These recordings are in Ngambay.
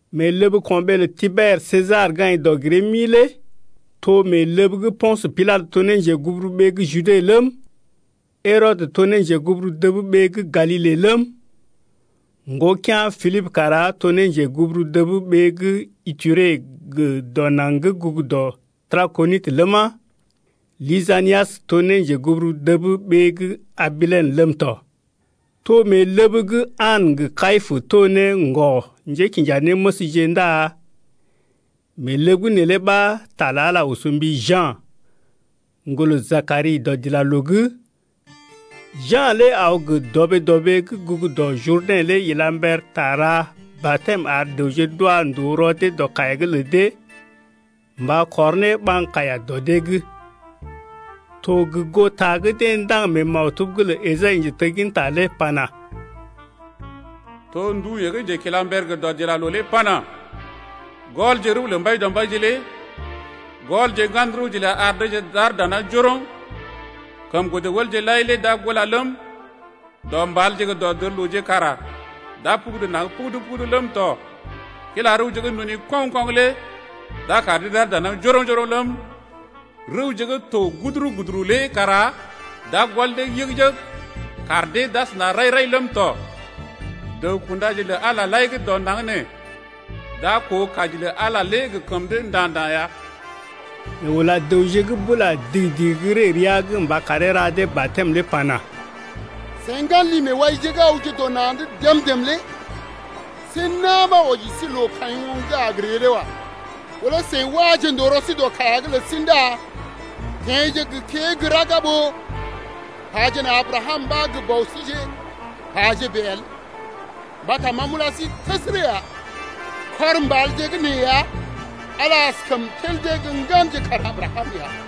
Mee ləb ko̰ɓee lə Tiber Sesar gə́ aḭ dɔg-giree-mi lé to mee ləb gə́ Po̰sə Pilatə to ne njeguburuɓee gə́ Jude ləm, Herɔdə to ne njeguburu dəb ɓee gə́ Galile ləm, ŋgokea̰ Pilibə kara to ne njeguburu dəb ɓee gə́ Ituree gə dɔ naŋg gə́ gugu dɔ Trakonitə ləma, Lisanias to ne njeguburu dəb ɓee gə́ Abilene ləm tɔ. To mee ləb gə́ An gə Kayipə to ne ŋgɔ-njékinjanéməsje ndá mee ləb’g neelé ɓa ta lə Ala oso mbi Ja̰, ŋgolə Jakari dɔdilaloo’g. Ja̰ lé aw gə dɔɓee-dɔɓee gə́ gugu dɔ Jurdɛ̰ lé ila mber ta ra batɛm ar dəwje d’wa ndòo rɔ dee dɔ kaiya’g lə dee mba kɔr ne ɓaŋg kaiya dɔ dee’g. To gə goo ta gə́ deḛ ndaŋg mee maktub’g lə Esai njetegginta lé pana: To ndu yeḛ gə́ njekilamber gə dɔdilaloo lé pana: Gɔlje rəw lə Mbaidɔmbaije lé Gɔlje ŋgan rəwje ləa ar deeje dana njoroŋ. Kəm godə wəlje lai lé d’a tula ləm, Dɔ mbalje gə dɔdərlooje kara d’a pugudu naŋg pugudu-pugudu ləm tɔ. Kila rəwje gə́ nduni koŋ-koŋ lé d’a kar dee d’ar dana njoroŋ-njoroŋ ləm, Rəwje gə́ to guduru-guduru lé kara d’a gɔl dee yəg-yəg kar dee d’asəna rai-rai ləm tɔ. Dəw-kundaje lə Ala lai gə́ dɔ naŋg nee d’a koo kaji lə Ala lé gə kəm dee nda̰-nda̰ ya. Yeḛ ula dəwje gə́ bula digi-digi gə́ ree rəa’g mba karee ra dee batɛm lé pana: Seḭ ŋgan li-meewaije lé see na̰ ɓa wɔji sí loo kaḭ oŋg gə́ a ree lé wa. Ɓó lé seḭ waje ndòo rɔ sí dɔ kaiya’g lə sí ndá teḛje gə kée gə́ raga ɓó pajena Abrakam ɓa gə bɔ síje, paje bèe el! mbata ma m’ula sí təsərə ya, kɔr mbalje gə́ nee ya Ala lé askəm tel dee gə́ ŋganje kar Abrakam ya.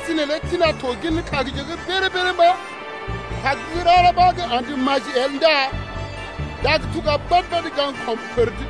Tina to ŋgira kagje’g béréré-béréré mba̰. Kag gə́ rara ɓa gə́ andə gə ka̰dee gə́ maji el ndá d’a tuga badə gaŋg kila pər’d.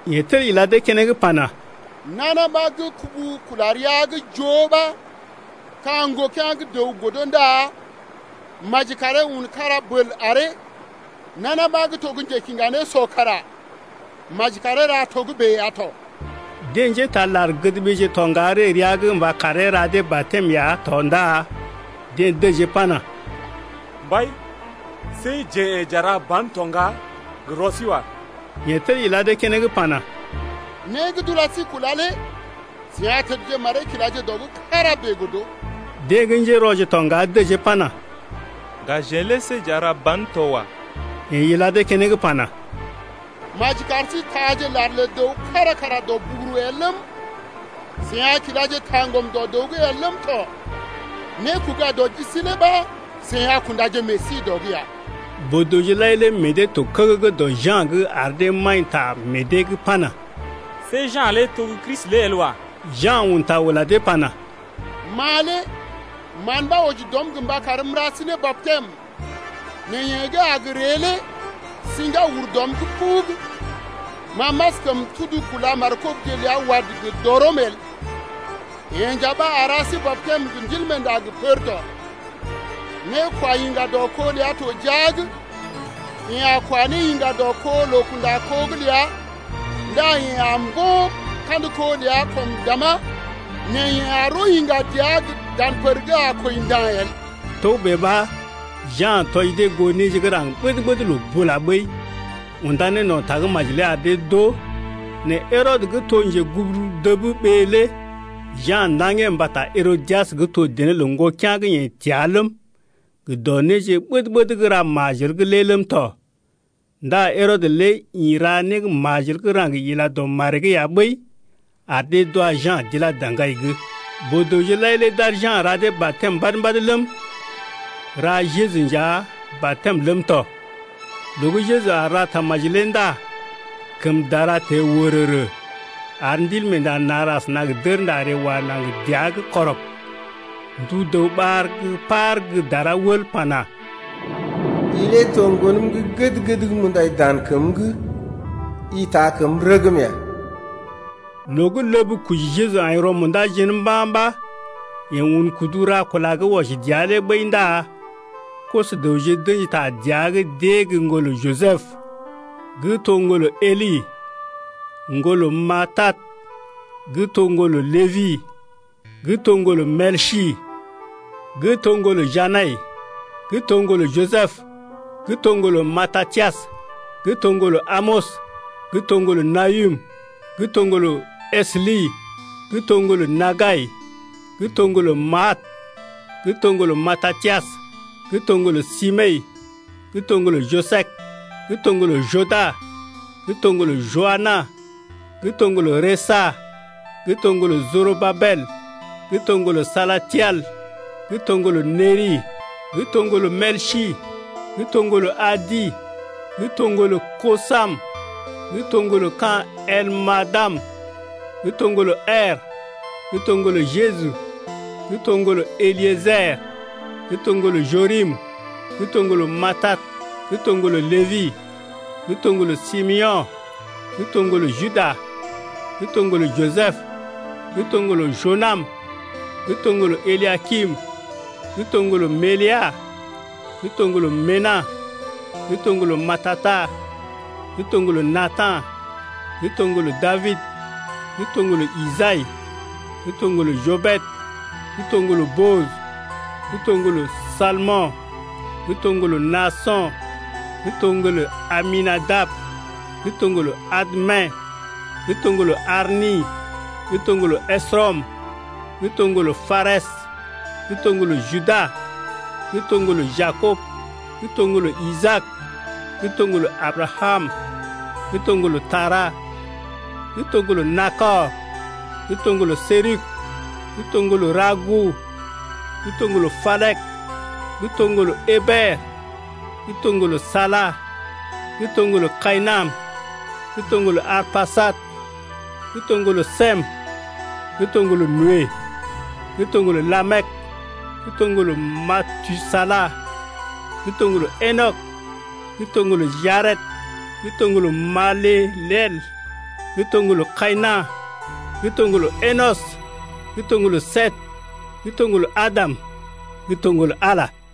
Yeḛ tel ila dee keneŋ pana: Nana ɓa gə́ kubu kula rəa’g joo ɓa ka̰ ŋgokea̰ gə́ dəw godo ndá maji karee un kára bəl aree. Nana ɓa gə́ to njekiŋga nésɔ kara maji karee ra togə́bè ya tɔ. Deḛ njétaa lar-gədɓeeje to ŋga ree rəa’g mba karee ra dee batɛm ya tɔ ndá deḛ dəjee pana: Mbai, see jeḛ yḛ̀ j’a ra ba̰ to ŋga gə rɔ sí wa. Yeḛ tel ila dee keneŋ pana: Né gə́ d’ula sí kula lé seḭ a tədje maree kilaje dɔ’g kára bèe godo. Deḛ gə́ njérɔje tɔ ŋga dəjee pana: Ŋga jeḛ lé see j’a ra ba̰ to wa. Yeḛ ila dee keneŋ pana: Maji kar sí taaje lar lə dəw kára kara dɔ buguru el ləm, seḭ a kilaje taŋgɔm dɔ dəw’g el ləm tɔ. Nékoga-dɔ-ji sí lé ɓa seḭ a kundaje meḛ sí dɔ’g ya. Boo-dəwje lai lé meḛ dee to kəgəgə dɔ Ja̰’g ar dee maḭta meḛ dee’g pana: See Ja̰ lé to gə́ Kristi lé el wa. Ja̰ un ta ula dee pana: Ma lé mán ɓa wɔji dɔm gə mba karm m’ra sí ne batɛm nɛ yeḛ gə́ a gə ree lé siŋgá ur dɔm’g pubug. Ma m’askəm tudu kúla négɔlje ləa wad lé gə dɔrɔm el. Yeḛ nja ɓa a ra sí batɛm gə Ndilmeenda gə pər tɔ. Nékwayiŋga dɔ kó ləa to jia’g, yeḛ a kwa ne yiŋga dɔ kó loo-kunda-kó’g ləa ndá yeḛ a mbo̰ kandə kó ləa kɔm dàmá nɛ yeḛ a roo yiŋga dəa dan pər gə́ a kwəi nda̰ el. Togə́bè ɓa Ja̰ tɔji dee goo néje gə́ raŋg ɓəd-ɓəd loo bula ɓəi, unda ne no̰ tagə́maji lé ar dee d’oo. Nɛ Herɔdə gə́ to njeguburu dəb ɓee lé Ja̰ ndaŋgee mbata Herodias gə́ to dené lə ŋgokea̰ gə́ yeḛ təa ləm, gə dɔ néje ɓəd-ɓəd gə́ ra majel’g lé ləm tɔ. Ndá Herɔdə lé ḭ ra né gə́ majel gə́ raŋg ila dɔ maree’g ya ɓəi, ar dee d’wa Ja̰ d’ilá daŋgai’g. Boo-dəwje lai lé d’ar Ja̰ ra dee batɛm mbad-mbad ləm, ra Jeju nja batɛm ləm tɔ. Loo gə́ Jeju aar ra tamaji lé ndá kəm dara teḛ wərərə ar Ndilmeenda nar asəna gə dərnda ree si dəa’g. Ndu dəw ɓar gə́ par gə́ dara wəl pana: I lé to Ŋgonəm gə́ gəd-gəd gə́ m’undai dan kəm’g, i taa kəm rəgm ya. Loo gə́ ləb koji Jeju aḭ rɔ-munda jén mba̰ ɓa yeḛ un kudu ra kula gə́ wɔji dəa lé ɓəi ndá koso-dəwje d’ə̰ji ta dəa’g d’ée gə́ ŋgolə Jisəb, gə́ to ŋgolə Heli ŋgolə Matat, gə́ to ŋgolə Lébi, gə́ to ŋgolə Melsi, gə́ to ŋgolə Janai, gə́ to ŋgolə Jisəb, gə́ to ŋgolə Matatias, gə́ to ŋgolə Amɔs, gə́ to ŋgolə Nahum, gə́ to ŋgolə Esli, gə́ to ŋgolə Naggai, gə́ to ŋgolə Maat, gə́ to ŋgolə Matatias, gə́ to ŋgolə Semei, gə́ to ŋgolə Joses, gə́ to ŋgolə Joda, gə́ to ŋgolə Joanan, gə́ to ŋgolə Resa, gə́ to ŋgolə Jorobabel, gə́ to ŋgolə Salatiel, gə́ to ŋgolə Neri, gə́ to ŋgolə Melsi, gə́ to ŋgolə Adi, gə́ to ŋgolə Kosam, gə́ to ŋgolə ka̰ Elmadam, gə́ to ŋgolə Er, gə́ to ŋgolə Jeju, gə́ to ŋgolə Eliéjer, gə́ to ŋgolə Jorim, gə́ to ŋgolə Matat, gə́ to ŋgolə Lébi, gə́ to ŋgolə Simeo̰, gə́ to ŋgolə Juda, gə́ to ŋgolə Jisəb, gə́ to ŋgolə Jonam, gə́ to ŋgolə Eliakim, gə́ to ŋgolə Meləa, gə́ to ŋgolə Mena, gə́ to ŋgolə Matata, gə́ to ŋgolə Natan, gə́ to ŋgolə Dabid, gə́ to ŋgolə Isai, gə́ to ŋgolə Jobed, gə́ to ŋgolə Booj, gə́ to ŋgolə Salmo̰, gə́ to ŋgolə Naaso̰, gə́ to ŋgolə Aminadab, gə́ to ŋgolə Admin, gə́ to ŋgolə Arni, gə́ to ŋgolə Esrɔm, gə́ to ŋgolə Parɛs, gə́ to ŋgolə Juda, gə́ to ŋgolə Jakob, gə́ to ŋgolə Isaak, gə́ to ŋgolə Abrakam, gə́ to ŋgolə Tara, gə́ to ŋgolə Nakɔr, gə́ to ŋgolə Seruk, gə́ to ŋgolə Rago, gə́ to ŋgolə Palek, gə́ to ŋgolə Eber, gə́ to ŋgolə Sala, gə́ to ŋgolə Kayinam, gə́ to ŋgolə Arpajad, gə́ to ŋgolə Sem, gə́ to ŋgolə Noe, gə́ to ŋgolə Lamek, gə́ to ŋgolə Matusala, gə́ to ŋgolə Enɔk, gə́ to ŋgolə Jared, gə́ to ŋgolə Maléléel, gə́ to ŋgolə Kayina̰, gə́ to ŋgolə Enɔs, gə́ to ŋgolə Set, gə́ to ŋgolə Adam, gə́ to ŋgolə Ala lé.